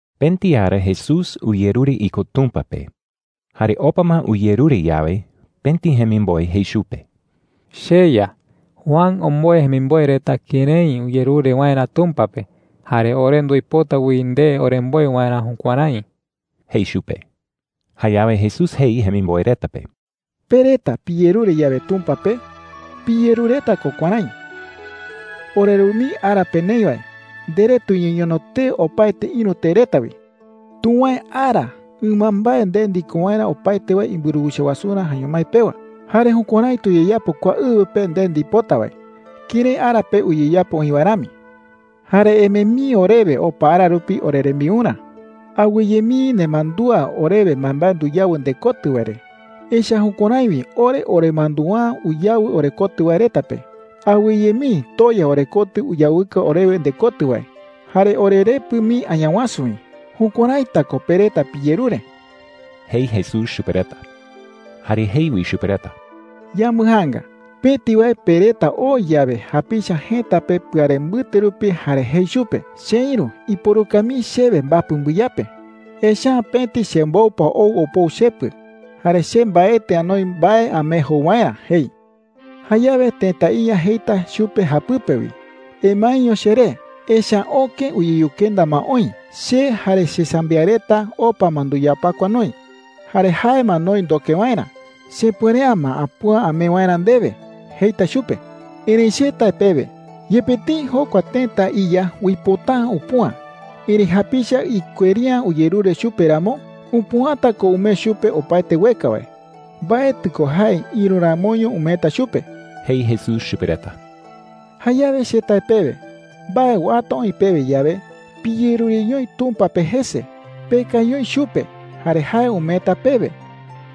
Pëti ara Jesús uyerure iko Tumpa pe. Jare opa ma uyerure yawe, pëti jemimboe jei chupe: “CheYa, Juan omboe jemimboe reta kërái uyerure waerä Tumpa pe. Jare ore nduipota wi nde oremboe waerä jukuärái,” jei chupe. Jayawe Jesús jei jemimboe reta pe: “Pe reta piyerure yawe Tumpa pe, piyerureta ko kuärái: ‘OreRu mii ara pe neï wae, nderee tuñeñono tee opaete ïru tee reta wi. Tuwäe ara ɨmambae nde ndiko waerä opaete wae imburuwicha wasurä jaeño mái pewa. Jare jukuärái tuyeyapo kua ɨwɨ pe nde ndipota wae kërái ara pe uyeyapo oï wae rami. Jare emee mii orewe opa ara rupi orerembiurä. Awɨye mii nemandúa orewe mbaembae nduyawɨ ndekotɨ wae re, echa’ä jukuärái wi ore oremandua’ä uyawɨ orekotɨ wae reta pe. Awɨye mii toya orekotɨ uyawɨka orewe ndekotɨ wae, jare orerepɨ mii Añawasu wi.’ Jukuäraita ko pe reta piyerure,” jei Jesús chupe reta. Jare jei wi chupe reta: “Yambɨjaanga. Pëti wae pe reta oo yawe japicha jëta pe pɨare mbɨte rupi jare jei chupe: ‘Cheïru, iporuka mii chewe mbapɨ mbɨyape. Echa’ä pëti chemboupa ou opou chepɨ, jare che mbaetɨ anoi mbae amee jou waerä,’ jei. “Jayawe tëta iya jeita chupe japɨpe wi: ‘Emaeño cheré. Echa’ä öke uyeyukenda ma oï. Che jare chesambiaɨ reta opa ma nduyapakua noï. Jare jae ma noï ndoke waerä. Chepuere’ä ma apüa amee waerä ndewe,’ jeita chupe. “Erëi che tae pewe, yepe tëi jokua tëta iya uipota’ä upüa, erëi japicha ikueri’ä uyerure chupe ramo, upüata ko umee chupe opaete ueka wae. Mbaetɨ ko jae ïru ramoño umeeta chupe,” jei Jesús chupe reta. “Jayawe che tae pewe, mbae uata oï pewe yawe, piyerureñoi Tumpa pe jese. Pekañoi chupe, jare jae umeeta pewe.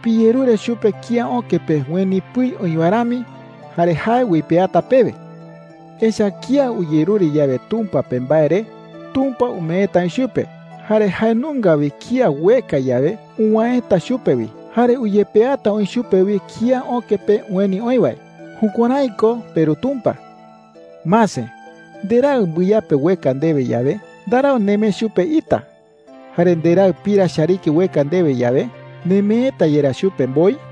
Piyerure chupe kía öke pe ueni pɨi oï wae rami, jare jae uipeata pewe,” jei. “Echa’ä kía uyerure yawe Tumpa pe mbae re, Tumpa umeeta oï chupe. Jare jae nunga wi kía ueka yawe, uwäeta chupe wi. Jare uyepeata oï chupe wi kía öke pe ueni oï wae. Jukuärái ko peRu Tumpa,” jei. “Mase. Nderaɨ mbɨyape ueka ndewe yawe, ndarau nemee chupe ita. Jare nderaɨ pira chariki ueka ndewe yawe, ¿nemeeta yerá chupe mboi?” jei.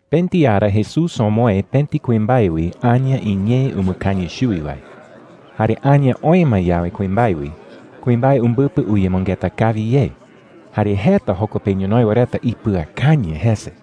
Pëti ara Jesús omoë pëti kuimbae wi aña iñee umɨkañɨ chuwi wae. Jare aña oë ma yawe kuimbae wi, kuimbae umbɨpɨ uyemɨngeta kawi ye. Jare jeta joko pe ñonoï wae reta ipɨakañɨ jese.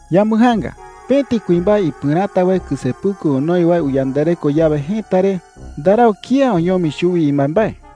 “Yambɨjaanga. Pëti kuimbae ipɨräta wae kɨsepuku onoi wae uyandareko yawe jëta re, ndarau kía oñomi chuwi imbaembae,” jei.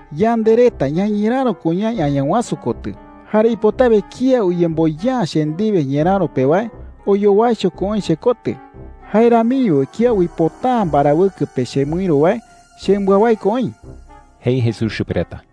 “Yande reta ñañeräro ko ñaï Añawasu kotɨ. Jare ipotawe kía uyemboya’ä che ndiwe ñeräro pe wae, oyowaicho ko oï chekotɨ. Jae ramiño wi kía uipota’ä mbarawɨkɨ pe chemɨïru wae, chembɨawái ko oï,” jei Jesús chupe reta.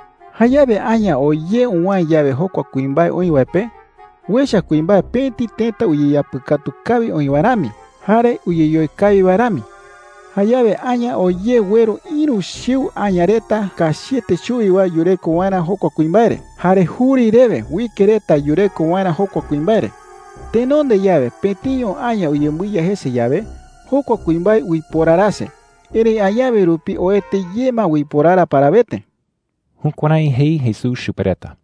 Jayawe aña oo ye uwäe yawe jokua kuimbae oï wae pe, uecha kuimbae pëti tëta uyeyapɨkatu kawi oï wae rami jare uyeyoe kawi wae rami,” jei. “Jayawe aña oo ye ueru ïru chiu aña reta kachiete chuwi wae yureko waerä jokua kuimbae re. Jare juri rewe uike reta yureko waerä jokua kuimbae re,” jei. “Tenonde yawe, pëtiño aña uyembɨiya jese yawe, jokua kuimbae uiporarase. Erëi añawe rupi oete ye ma uiporara parawete.” Jukuärái jei Jesús chupe reta.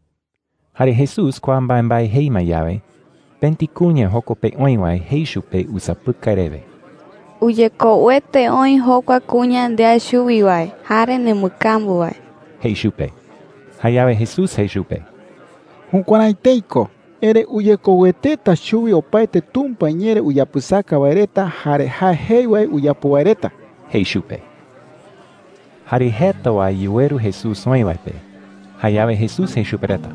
Jare Jesús kua mbaembae jei ma yawe, pëti kuña joko pe oï wae jei chupe usapɨkai rewe: “Uyekouete oï jokua kuña ndea chuwi wae jare nembɨkambu wae,” jei chupe. Jayawe Jesús jei chupe: “Jukuärái tëi ko. Erëi uyekoueteta chuwi opaete Tumpa iñee re uyapɨsaka wae reta jare jae jei wae uyapo wae reta,” jei chupe. Jare jeta wae yuweru Jesús oï wae pe. Jayawe Jesús jei chupe reta: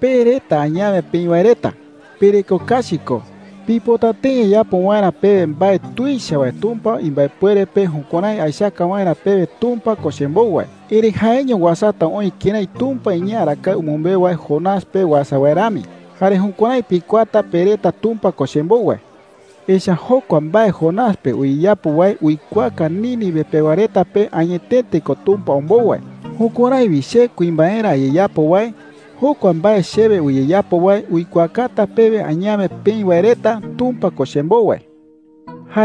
“Pe reta añawe peï wae reta, pereko kachi ko. Pipota tëi ayapo waerä pewe mbae tuicha wae Tumpa imbaepuere pe jukuärái aechaka waerä pewe Tumpa ko chembou wae. Erëi jaeño uasata oï kërái Tumpa iñee arakae umɨmbeu wae Jonás pe uasa wae rami. Jare jukuärái pikuaata pe reta Tumpa ko chembou wae,” jei. “Echa’ä jokua mbae Jonás pe uyeyapo wae uikuaaka Nínive pewa reta pe añetete ko Tumpa ombou wae. Jukuärái wi che kuimbaerä ayeyapo wae, jokua mbae chewe uyeyapo wae uikuaakata pewe añawe peï wae reta Tumpa ko chembou wae,” jei chupe reta.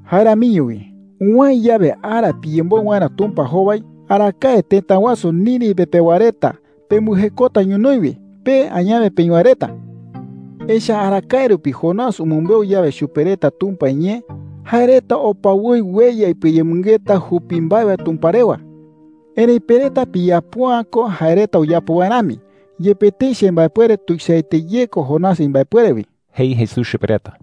“Jae ramiño wi, uwäe yawe ara piyemboɨ waerä Tumpa jowai, arakae tëta wasu Nínive pewa reta pembɨjekota ñonoï wi, pe añawe peï wae reta,” jei chupe reta. “Echa’ä arakae rupi Jonás umɨmbeu yawe chupe reta Tumpa iñee, jae reta opa woi ueya ipɨayemɨngeta jupi mbae wae Tumpa rewa. Erëi pe reta piyapo’ä ko jae reta uyapo wae rami, yepe tëi chembaepuere tuichaete ye ko Jonás imbaepuere wi,” jei Jesús chupe reta.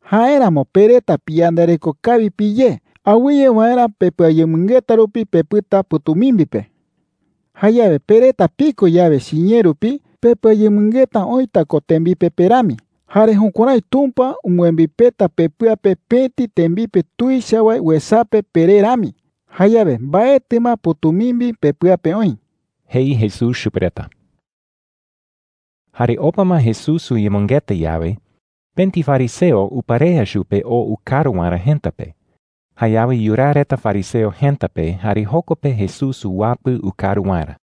“Jáeramo pe reta piyandareko kawi piyé, awɨye waerä pepɨayemɨngeta rupi pepɨta pɨ̈tumimbi pe,” jei chupe reta. “Jayawe pe reta piko yawe chiñee rupi, pepɨayemɨngeta oïta ko tembipe pe rami. Jare jukuärái Tumpa umbɨembipeta pepɨa pe pëti tembipe tuicha wae uesape peré rami. Jayawe mbaetɨ ma pɨ̈tumimbi pepɨa pe oï,” jei Jesús chupe reta. Jare opa ma Jesús uyemɨngeta yawe, pëti fariseo uparea chupe oo ukaru waerä jëta pe. Jayawe yuraa reta fariseo jëta pe, jare joko pe Jesús uwapɨ ukaru waerä.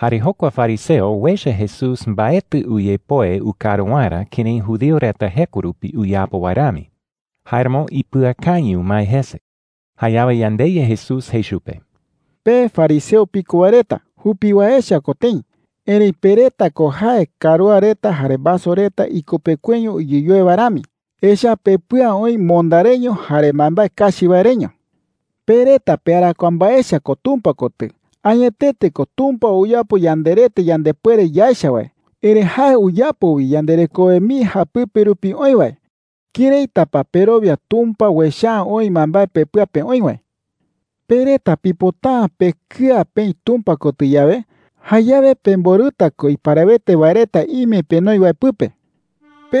Jare jokua fariseo uecha Jesús mbaetɨ uyepoe ukaru waerä kërái judío reta jeko rupi uyapo wae rami. Jáeramo ipɨakañɨ umae jese. Jayawe yandeYa Jesús jei chupe: “Pe fariseo piko wae reta, jupi wae echa ko tëi. Erëi pe reta ko jae karúa reta jare vaso reta ikupekueño uyeyoe wae rami. Echa’ä pepɨa oï monda reño jare mbaembae kachi wae reño,” jei chupe. “Pe reta pearakuaa mbae echa ko Tumpa kotɨ. Añetete ko, Tumpa uyapo yanderete yandepuere yaecha wae. Erëi jae uyapo wi yanderekowe mii japɨpe rupi oï wae. ¿Këraita pa perowia Tumpa uecha’ä oï mbaembae pepɨa pe oï wae?” jei. “Pe reta pipota’ä pekɨa peï Tumpa kotɨ yawe, jayawe pemborɨta ko iparawete wae reta ime penoi wae pɨpe,” jei chupe.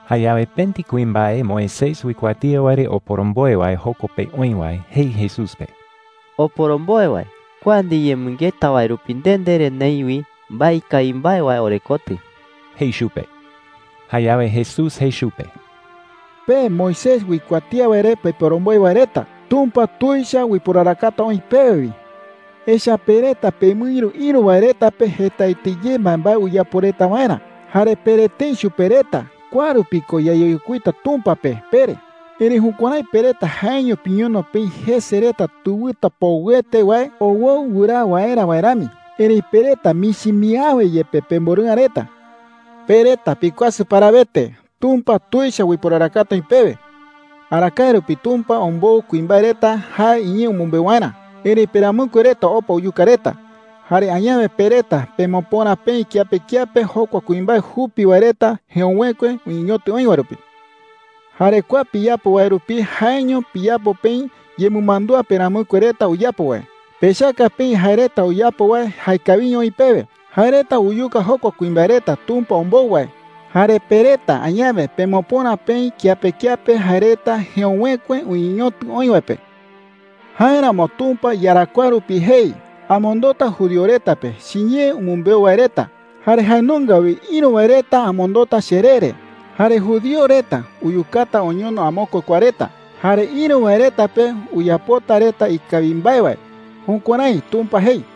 Jayawe pëti kuimbae Moisés uikuatía wae re oporomboe wae joko pe oï wae jei Jesús pe: “Oporomboe wae, kua ndiyemɨngeta wae rupi nde ndere neï wi mbae ikawi mbae wae orekotɨ,” jei chupe. Jayawe Jesús jei chupe: “Pe Moisés uikuatía wae re peporomboe wae reta, ¡Tumpa tuicha uiporarakata oï pewe wi!” jei chupe. “Echa’ä pe reta pemɨïru ïru wae reta pe jetaete ye mbaembae uyapo reta waerä, jare pere tëi chupe reta: ‘Kua rupi ko yayeyokuita Tumpa pe,’ pere. Erëi jukuärái pe reta jaeño piñono peï jese reta tewɨta poɨete wae owoɨ wɨraa waerä wae rami. Erëi pe reta michi mii awe yepe pemborɨ'ä reta,” jei chupe. “¡Pe reta pikuasɨ parawete! ¡Tumpa tuicha uiporarakata oï pewe!” jei. “Arakae rupi Tumpa ombou kuimbae reta jae iñee umɨmbeu waerä. Erëi peramɨkue reta opa uyuka reta. Jare añawe pe reta pemopöra peï kiape kiape jokua kuimbae jupi wae reta jeöwekue uñeñotɨ oï wae rupi,” jei. “Jare kua piyapo wae rupi jaeño piyapo peï yemɨmandúa peramɨkue reta uyapo wae. Pechaka peï jae reta uyapo wae jaekawiño oï pewe. Jae reta uyuka jokua kuimbae reta Tumpa ombou wae, jare pe reta añawe pemopöra peï kiape kiape jae reta jeöwekue uñeñotɨ oï wae pe,” jei chupe. “Jáeramo Tumpa iyarakuaa rupi jei: ‘Amondota judío reta pe chiñee umɨmbeu wae reta, jare jae nunga wi ïru wae reta amondota cheree re. Jare judío reta uyukata oñono amokue kua reta. Jare ïru wae reta pe uyapota reta ikawi mbae wae.’ Jukuärái Tumpa jei,” jei.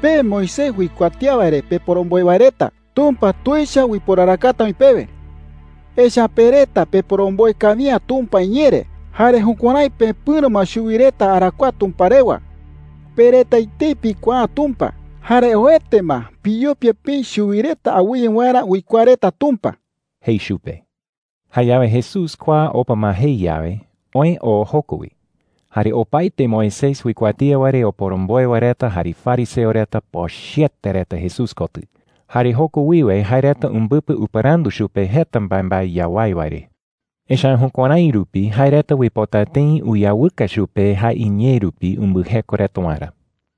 “Pe Moisés uikuatía wae re peporomboe wae reta, ¡Tumpa tuicha uiporarakata oï pewe!” jei chupe. “Echa’ä pe reta peporomboe kawi’ä Tumpa iñee re, jare jukuärái pepɨ̈ro ma chuwi reta arakuaa Tumpa rewa. Pe reta etei pikuaa’ä Tumpa. Jare oete ma, piyopia peï chuwi reta awɨye waerä uikuaa reta Tumpa,” jei chupe. Jayawe Jesús kua opa ma jei yawe, oë oo joko wi. Jare opaete Moisés uikuatía wae re oporomboe wae reta jare fariseo reta pochɨete reta Jesús kotɨ. Jare joko wiwe jae reta umbɨpɨ upɨrandu chupe jeta mbaembae yawái wae re. Echa’ä jukuärái rupi jae reta uipota tëi uyawɨka chupe jae iñee rupi umbɨjeko reta waerä.